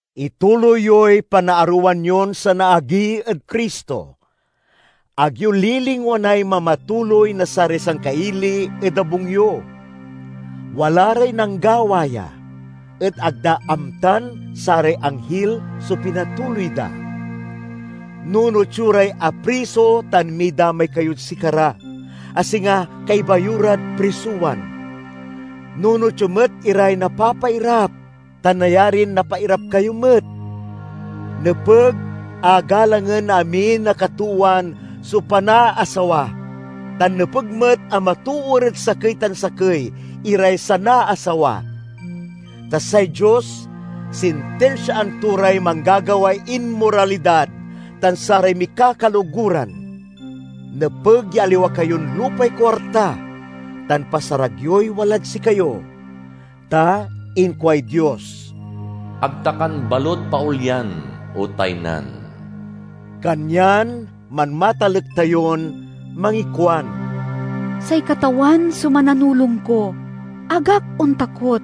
Ituloy yoy panaarowan yon sanaagi ed Cristo. Ag yo lilingwanay mamatuloy na saray sangkaili ed abung yo. Wala ray nanggawa ya, et ag da amtan saray anghil so pinatuloy da. Nunot yo ray apriso tan midamay kayod sikara, a singa kaiba yo rad prisowan. Nunot yo met iray napapairap, ta nayarin napairap kayo met. Nepeg a galangen na amin a katoowan so panaasawa, tan nepeg met a matoor ed sakey tan sakey iray sanaasawa. Ta say Dios sintinsiaan to ray manggagaway inmoralidad tan saray mikakaloguran. Nepeg ya aliwa kayon lupay kuarta, tan pasarag yoy walad sikayo. Ta inkuay Dios, "Ag ta kan balut paolyan o taynan." Kanyan manmatalek tayon mangikuan, "Say Katawan so mananulong ko, ag ak ontakot!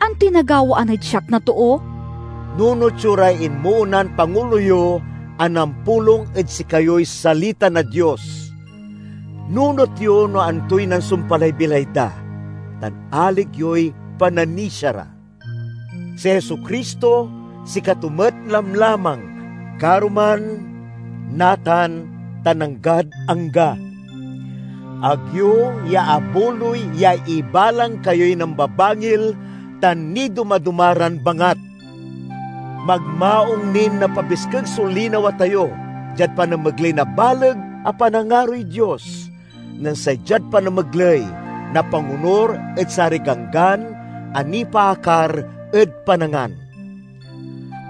Antoy nagawaan ed siak na too?" Nunot yo ray inmoonan pangulo yo a nampulong ed sikayoy salita na Dios. Nunot yo no antoy nansumpalay bilay da, tan alig yoy pananisia ra. Si Jesu-Cristo sikato met lamlamang karuman, natan, tan anggad angga. Ag yo iyaabuloy ya ibalang kayoy nambabangil tan nidoma-doma ran bangat. Magmaung nin napabiskeg so linawa tayo diad panamegley na baleg a panangaroy Dios, nen say diad panamegley na pangonur ed saray ganggan a nipaakar ed panangan.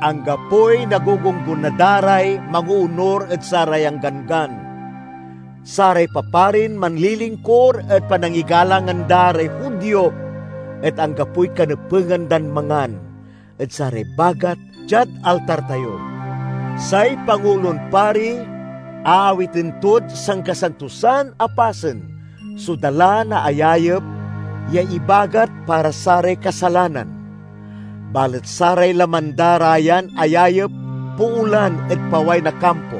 Anggapoy nagugunggona da ray mangoonur ed sarayan ganggan. Saray paparin manlilingkur ed panangigalangan da ray Judio et anggapoy kanepegan dan mangan ed saray bagat diad altar tayo. Say Pangulon Pari aawiten tod Sankasantosan a Pasen so dala na ayayep ya ibagat para saray kasalanan, balet saray laman da ra yan ayayep poolan ed paway na kampo.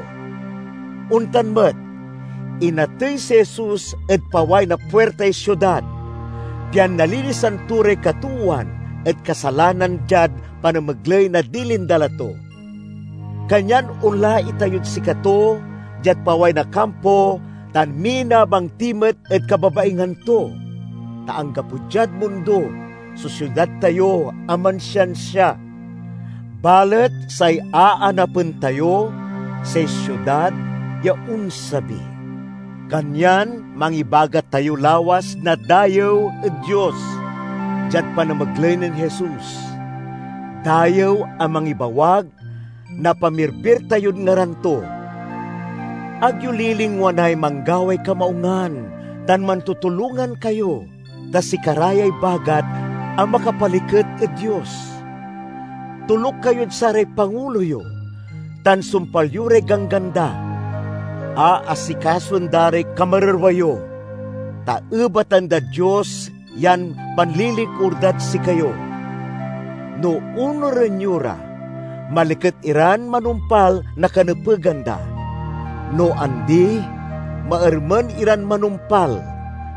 Ontan met, inatey si Jesus ed paway na puirtay siudad, pian nalinisan to ray katoowan ed kasalanan diad panamegley na dilin dala to. Kanyan onla itayod sikato diad paway na kampo tan minabang ti met ed kababaingan to. Ta anggapo diad mundo so siudad tayo a mansiansia; balet say aanapen tayo say siudad ya onsabi. Kanyan mangibagat tayo lawas na dayew ed Dios diad panamegley nen Jesus—dayew a mangibawag na pamirbir tayod ngaran to. Ag yo lilingwanay manggaway kamaungan tan mantutulongan kayo, ta sikara yay bagat a makapaliket ed Dios. Toluk kayod saray pangulo yo tan sumpal yo ray ganggan da. Aasikasoen da ray kamarerwa yo, ta ebatan dad Dios yan panlilingkur dad sikayo. No onuren yo ra, maliket iran manumpal na kanepegan da; no andi, maermen iran manumpal,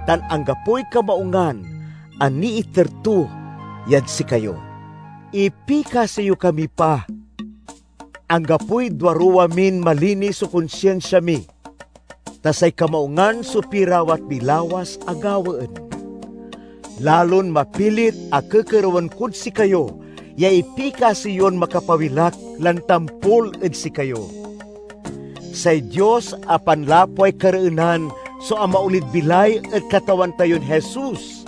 tan anggapoy kamaungan a niiter to yad sikayo. Ipikasi yo kami pa. Anggapoy duaruwa min malinis so konsinsia mi, ta say kamaungan so pirawat mi lawas a gawaen. Lalon mapilit a kekerewen kod sikayo ya ipikasi yon makapawil ak lan tampol ed sikayo. Say Dios a panlapway kareenan so amaolid bilay ed Katawan tayon Jesus,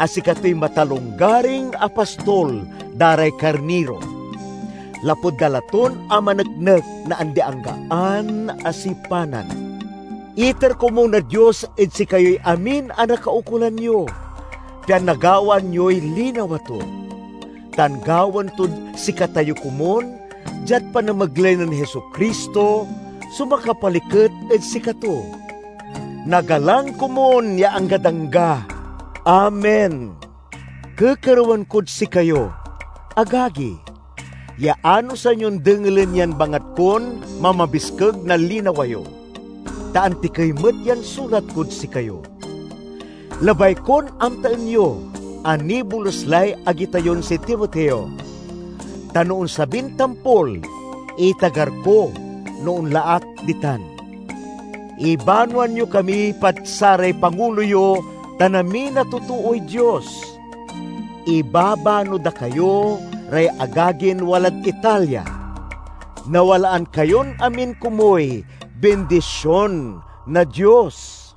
a sikatoy Matalonggaring a Pastol da ray karniro, lapud dala ton amaneknek na andi-anggaan a sipanan. Iter komun na Dios ed sikayoy amin a nakaukolan yo, pian nagawaan yoy linawa to, tan gawaen tod sikatayo komun, diad panamegley nen Jesu-Cristo, so makapaliket ed sikato. Nagalang komun ya anggad angga! Amen. Kekerewen kod sikayo, agagi, ya anosan yon dengelen yan bangat kon mamabiskeg na linawa yo, ta antikey met yan sulat kod sikayo. Labay kon amtaen yo a nibolus lay agi tayon si Timoteo, tan no onsabin tampol, itagar ko no onla ak ditan. Ibanoan yo kami pad saray pangulo yo tan amin a totooy Dios. Ibabano da kayo ray agagin walad Italia. Nawalaan kayon amin komuy bindision na Dios.